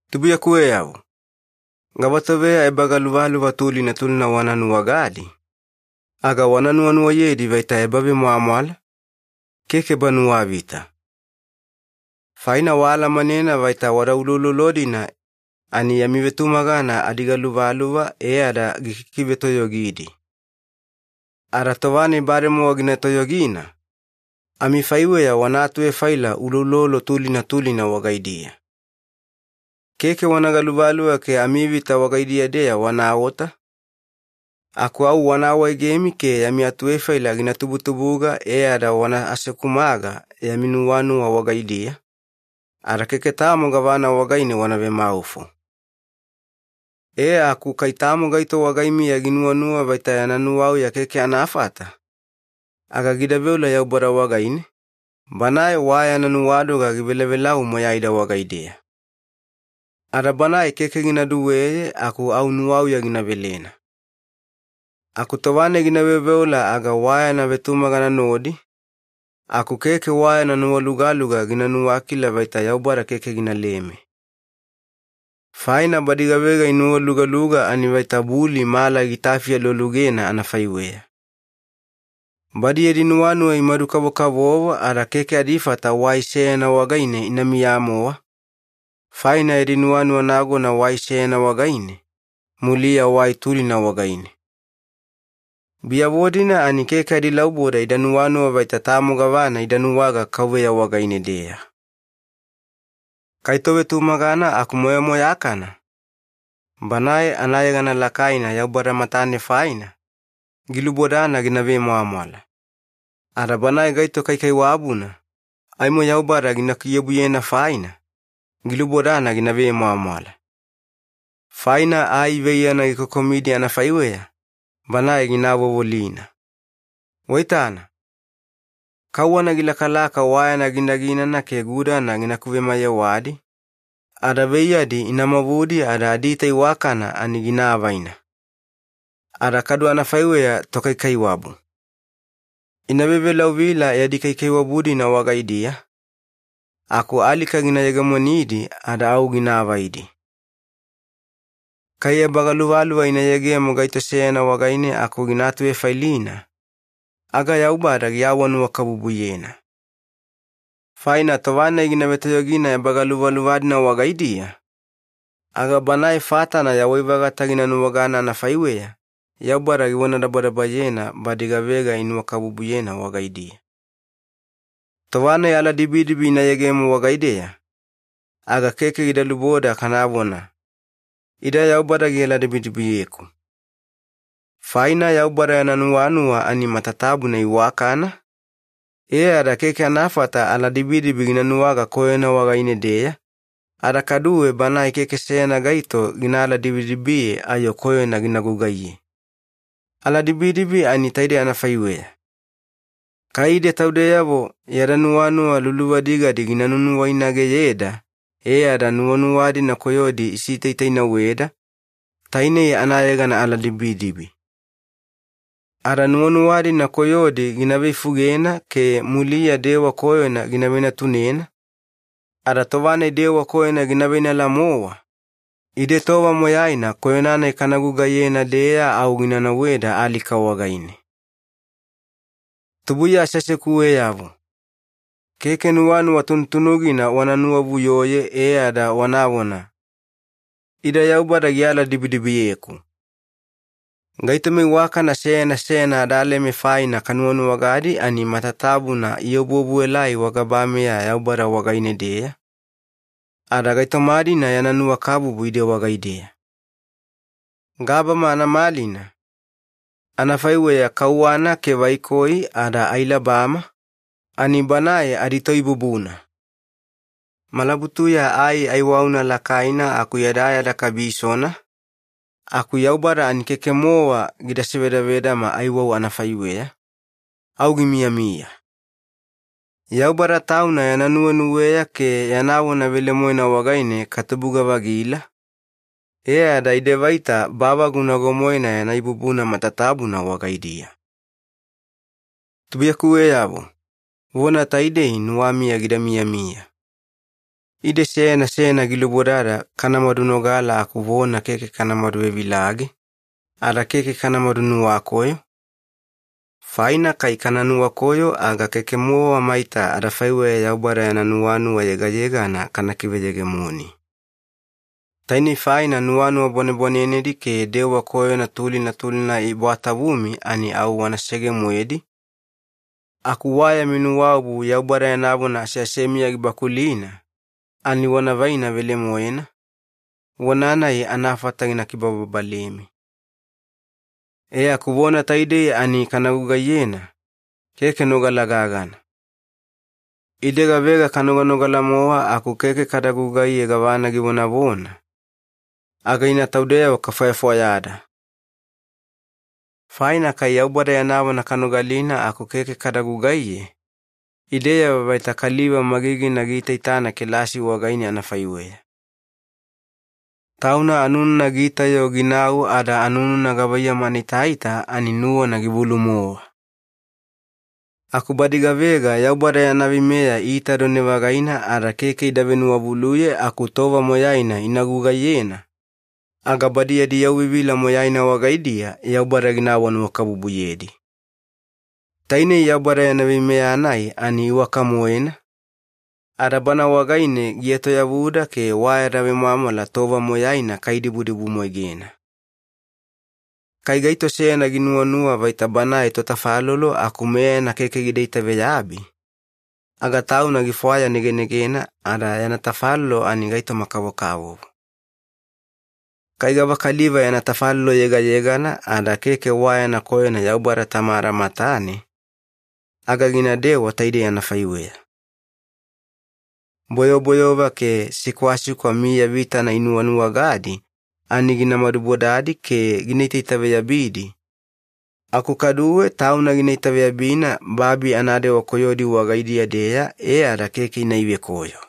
Tubuiyakuweyavo, gavatoveya ebagaluvaluva tulina tulina wana nuwagadi, aga wana nuwanuwayedi vaita ebavemwamwala, keke ebanuwavita. Faina waalamanena vaita wada uloulolo-dina ani yami vetumagana adigaluvaluva e ada gikikivetoyogidi. Ada tova-nai bademowa gina toyogina, amifaiweya wana atuvefaila uloulolo tulina tulina wagaidiya. Keke wana galuvaluva ke amivita wagaidiya-deya wanaota, aku au wana awaegemi ke yami atuvefaila gina tubutubuga e ada wana asekumaga yami nuwanuwa wagaidiya, ada keke tamo gavana wagaine wana vemaufo. E aku kai tamo gaito wagaimiya ginuwanuwa vaita yana nuwauya keke anafata, aga gida veola Yaubada wagaine, Banae wa yana nuwadoga givelavelau moyaida wagaideya. Ada Banae keke gina duweye aku au nuwauya gina velena. Aku tova-nai gina veoveola aga wa yana vetumagana nodi, aku keke wa yana nuwalugaluga gina nuwakila vaita Yaubada keke ginaleme. Faina badi gavega inuwalugaluga ani vaita buli mala gitafi alualugena anafaiweya. Badi yadi nuwanuwa imadu-kavokavovo ada keke adifata wai seyana wagaine inamiya-mowa, faina yadi nuwanuwa nagona wai seyana wagaine, muliya wai tulina wagaine. Biyavo-dina ani keke adilauboda ida nuwanuwa vaita tamo gavana ida nuwaga KAUVEYA wagaine-deya. Kai tovetumagana aku moyamoyakana, banae anayegana lakaina Yaubada matane faina, gilubodana gina vemwamwala. Ada banae gaito kaikaiwabuna, aimo Yaubada gina kiobuyena faina, gilubodana gina vemwamwala. Faina ai veiyana gikokomidi anafaiweya, banae gina avovolina. Waitana, kauwana gilakalaka wa yana ginaginana ke gudana gina kuvemayewadi, ada veiyadi ina mavudi ada adiita iwakana ani gina avaina. Ada kadu anafaiweya tokaikaiwabu. Ina vevelauvila yadi kaikaiwabu-dina wagaidiya, aku alika gina yegemonidi ada au gina avaidi. Kai ebagaluvaluva ina yegemo gaito seyana wagaine aku gina atuvefailina, aga Yaubada giawanuwakabubuyena. Faina tova-nai gina vetoyogina ebagaluvaluva-dina wagaidiya, aga banae fatana yawai-vagata gina nuwagana anafaiweya Yaubada givonadabadabayena badi gavega inuwakabubuyena wagaidiya. Tova-nai aladibidibi ina yegemo wagaideya, aga keke gida luboda kanavona, “Ida Yaubada gialadibidibiyeku.” Faina Yaubada yana nuwanuwa ani matatabuna iwakana, e ada keke anafata aladibidibi gina nuwaga koyona wagaine-deya, ada kaduwe Banae keke seyana gaito gina aladibidibiye ayo koyona gina gugaiye. Aladibidibi ani taidei anafaiweya. Kai ide taudeyavo yada nuwanuwa luluvadigadi gina nunuwainageyeda e ada nuwanuwa-dina koyodi isitaitainauweda, tainei anayegana aladibidibi. Ada nuwanuwa-dina koyodi gina veifugena ke muliya dewa koyona gina venatunena, ada tova-nai dewa koyona gina veinala-mowa, ide tova moyaina koyona-nai kana gugaiyena-deya au gina nauweda alika wagaine. Tubuiya aseasekuweyavo, keke nuwanuwa tunutunugina wana nuwavuyoye e ada wanavona, “Ida Yaubada gialadibidibiyeku.” Gaitoma iwakana seyana seyana adaleme faina kanuwanuwagadi ani matatabuna iobuobuelai wagabameya Yaubada wagaine-deya, ada gaitoma-dina yana nuwakabubu ide wagaideya. Gabama anamalina, anafaiweya kauwana ke vaikoi ada ailabama, ani Banae adiToibubuna. Malabutuya ai aiwauna lakaina aku yadayada kabisona, aku Yaubada ani keke-mowa gida sivedavedama aiwau anafaiweya, au gimiyamiya. Yaubada Tauna yana nuwenuweya ke yana vona velemoena wagaine katubuga-vagila, e ada ide vaita bavagu nago-moena yana ibubuna matatabuna wagaidiya. Tubuiyakuweyavo, vona taidei nuwamiya gida miyamiya. Ide seyana seyana gilubodada kanamadu nogala aku vona keke kanamadu vevilage, ada keke kanamadu nuwakoyo, faina kai kana nuwakoyo aga keke-mowa maita adafaiweya Yaubada yana nuwanuwa yegayegana kana kiveyegemoni. Tainei faina nuwanuwa bwanebwanenedi ke dewa koyona tulina tulina ibwatavumi ani au wanasege-moedi, aku wa yami nuwaobu Yaubada yana vona aseasemiya gibakulina ani wana vaina velemoena, vona-nai anafata gina kibababalemi. E aku vona taidei ani kana gugaiyena, keke nogala gagana. Ide gavega kanoganogala-mowa aku keke kada gugaiye gavana givonavona, aga ina taudeyavo kafwayafwayada. Faina kai Yaubada yana vona kanogalina aku keke kada gugaiye, ideyavo vaita kaliva magigina giitaitana kelasi wagaine anafaiweya. Tauna anununa giita-yo ginau ada anununa gavaiyamu anaitaita ani nuwana givulu-mowa. Aku badi gavega Yaubada yana veimeya iitadone-vagaina ada keke ida venuwavuluye aku tova moyaina ina gugaiyena, aga badi yadi yauvivila moyaina wagaidiya Yaubada gina awanuwakabubuyedi. Tainei Yaubada yana veimeya-nai ani iwaka-moena, ada bana wagaine gietoyavuda ke wa yada vemwamwala tova moyaina kaidibudibumwaigena. Kai gaito seyana ginuwanuwa vaita banae totafalolo aku meyana keke gida itaveyabi, aga tauna gifwayanegenegena ada yana tafalolo ani gaitoma-kavokavovo. Kai gavakaliva yana tafalolo yegayegana ada keke wa yana koyona Yaubada Tamada matane, aga ginadewa taidei anafaiweya. Boyoboyova ke sikwasikwa miya vitana inuwanuwagadi ani gina madubodadi ke gina itaitaveyabidi, aku kaduwe tauna gina itaveyabina babi anadewa koyodi wagaidiya-deya e ada keke ina ivekoyo.